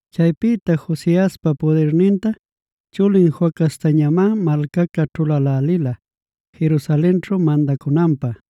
Chaypïta Josiaspa pudirninta chulin Joacaztañamá malcaca ćhulälälila Jerusalenćhu mandacunanpä.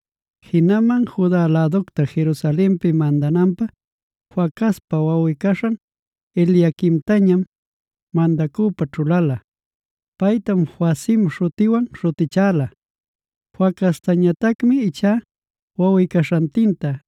Jinaman Juda läducta Jerusalenpi mandananpä Joacazpa wawꞌi-caśhan Eliaquimtañam mandacüpä ćhuläla. Paytam Joacim śhutiwan śhutichäla. Joacaztañatacmi ichá wawꞌi-caśhantinta,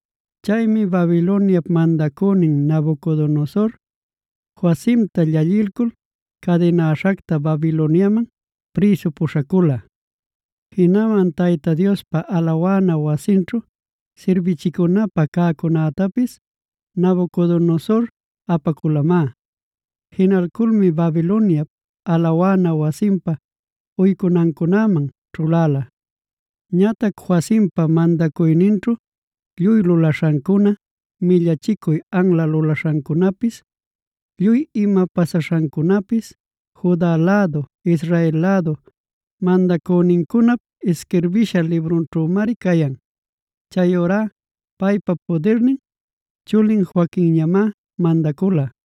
Chaymi Babiloniap mandacünin Nabucodonosor,c Joacimta llallilcul cadinäśhacta Babiloniaman prïsu puśhacula. Jinaman Tayta Diospa alawana wasinćhu sirbichicunapä cäcunätapis Nabucodonosor apaculamá. Jinalculmi Babiloniap alawana wasinpa uycunancunaman ćhuläla. Ñatac Joacimpa mandacuyninćhu lluy lulaśhancuna, millachicuy anla lulaśhancunapis, lluy ima pasaśhancunapis Juda lädu Israel lädu mandacünincunap isquirbisha librunćhümari cayan. Chayurá paypa pudirnin chulin Joaquinñamá mandacula.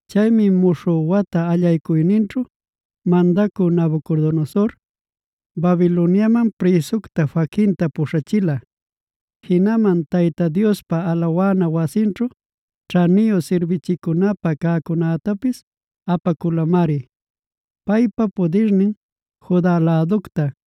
Chaymi muśhü watap allaycuyninćhue mandacü Nabucodonosor, Babiloniamanf prïsucta Joaquinta puśhachila. Jinaman Tayta Diospa alawana wasinćhu ćhaniyu sirbichicunapä cäcunactapis apaculamari. Paypa pudirnin Juda läducta,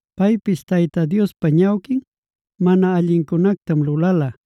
Paypis Tayta Diospa ñawquin mana allincunactam lulala.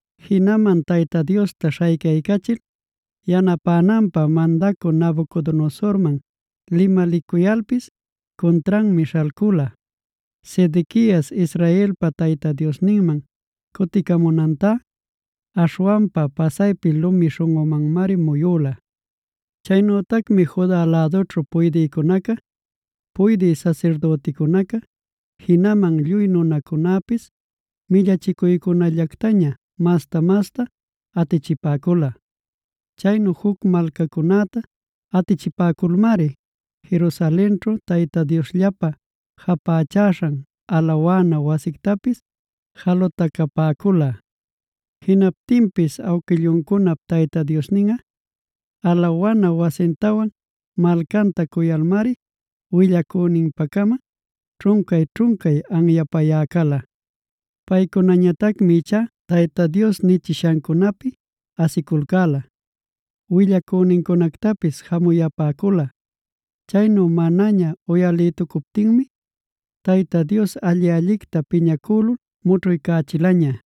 Jinaman Tayta Diosta śhaycaycachil yanapänanpä mandacü Nabucodonosormanj limalicuyalpis cuntranmi śhalcula. Sedequias Israelpa Tayta Diosninman cuticamunantá aśhwanpa pasaypi lumi śhunꞌumanmari muyüla. Chaynütacmi Juda lädućhu puydïcunaca, puydï sasirdüticunaca, jinaman lluy nunacunäpis millachicuycunallactaña masta-masta atichipäcula. Chaynu juc malcacunäta atichipäculmari Jerusalenćhu Tayta Diosllapä japächaśhan alawana wasictapis jalutacapäcula. Jinaptinpis awquilluncunap Tayta Diosninꞌa alawana wasintawan malcanta cuyalmari, willacüninpa-cama ćhuncay-ćhuncay anyapayä cala. Paycunañatacmi ichá Tayta Dios nichishancunäpi asiculcäla, willacünincunactapis jamuyapäcula. Chaynu manaña uyalïtucuptinmi Tayta Dios alli-allicta piñacülul mućhuycächilaña.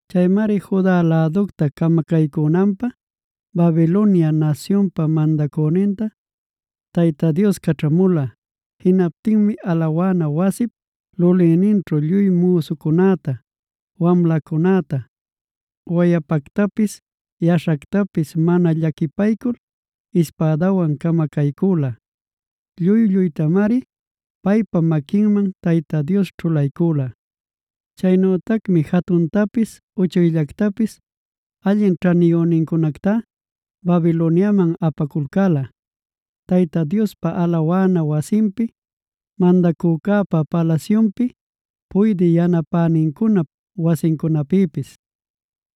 Chaymari Juda läducta camacaycünanpä Babiloniak nasyunpa mandacünintal Tayta Dios caćhamula. Jinaptinmi alawana wasip lulïninćhu lluy müsucunäta, wamlacunäta, wayapactapis, yaśhactapis mana llaquipaycul ispädawan camacaycüla. Lluy-lluytamari paypa maquinman Tayta Dios ćhulaycüla. Chaynütacmi jatuntapis uchuyllactapis allin ćhaniyünincunactá Babiloniaman apaculcäla Tayta Diospa alawana wasinpi, mandacücäpa palasyunpi, puydï yanapänincunap wasincunapïpis.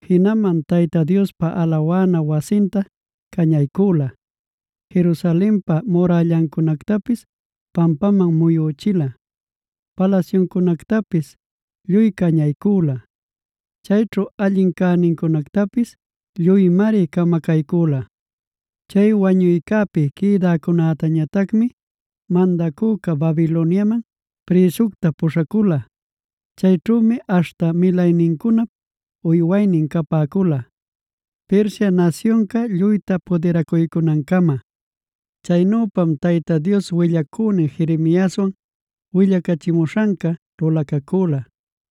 Jinaman Tayta Diospa alawana wasinta cañaycüla,m Jerusalenpa murällancunactapis pampaman muyüchila, palasyuncunactapis lluy cañaycüla, chayćhu allin cänincunactapis lluymari camacaycüla. Chay wañuycäpi quïdäcunätañatacmi mandacüca Babiloniaman prïsucta puśhacula. Chayćhümi aśhta milaynincunap uywaynin capäcula Persia nasyunca lluyta pudiracuycunancama. Chaynüpam Tayta Dios willacünin Jeremiaswan willacachimuśhanca lulacacüla.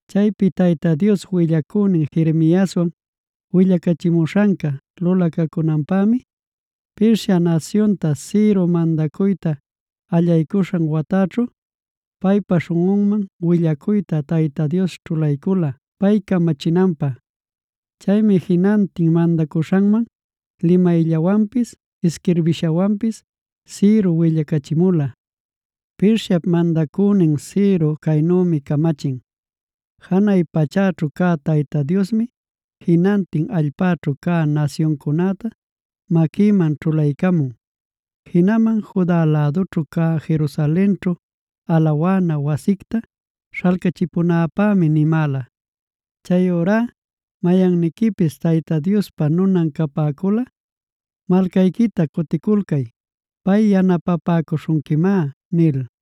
Chaypi Tayta Dios willacünin Jeremiaswan willacachimuśhanca lulacacunanpämi Persia nasyunta Ciro mandacuyta allaycuśhan wataćhu, paypa śhunꞌunman willacuyta Tayta Dios ćhulaycula pay camachinanpä. Chaymi jinantin mandaśhanman limayllawanpis isquirbishawanpis Ciro willacachimula: “Persiap mandacünin Ciro caynümi camachin: ‘Janay pachäćhu cä Tayta Diosmi jinantin allpäćhu cä nasyuncunäta maquïman ćhulaycamun. Jinaman Juda lädućhu cä Jerusalenćhuo alawana wasicta śhalcachipunäpämi nimäla. Chayurá mayanniquipis Tayta Diospa nunan capäculꞌa malcayquita cuticulcay. Pay yanapapäcuśhunquimá’” nil.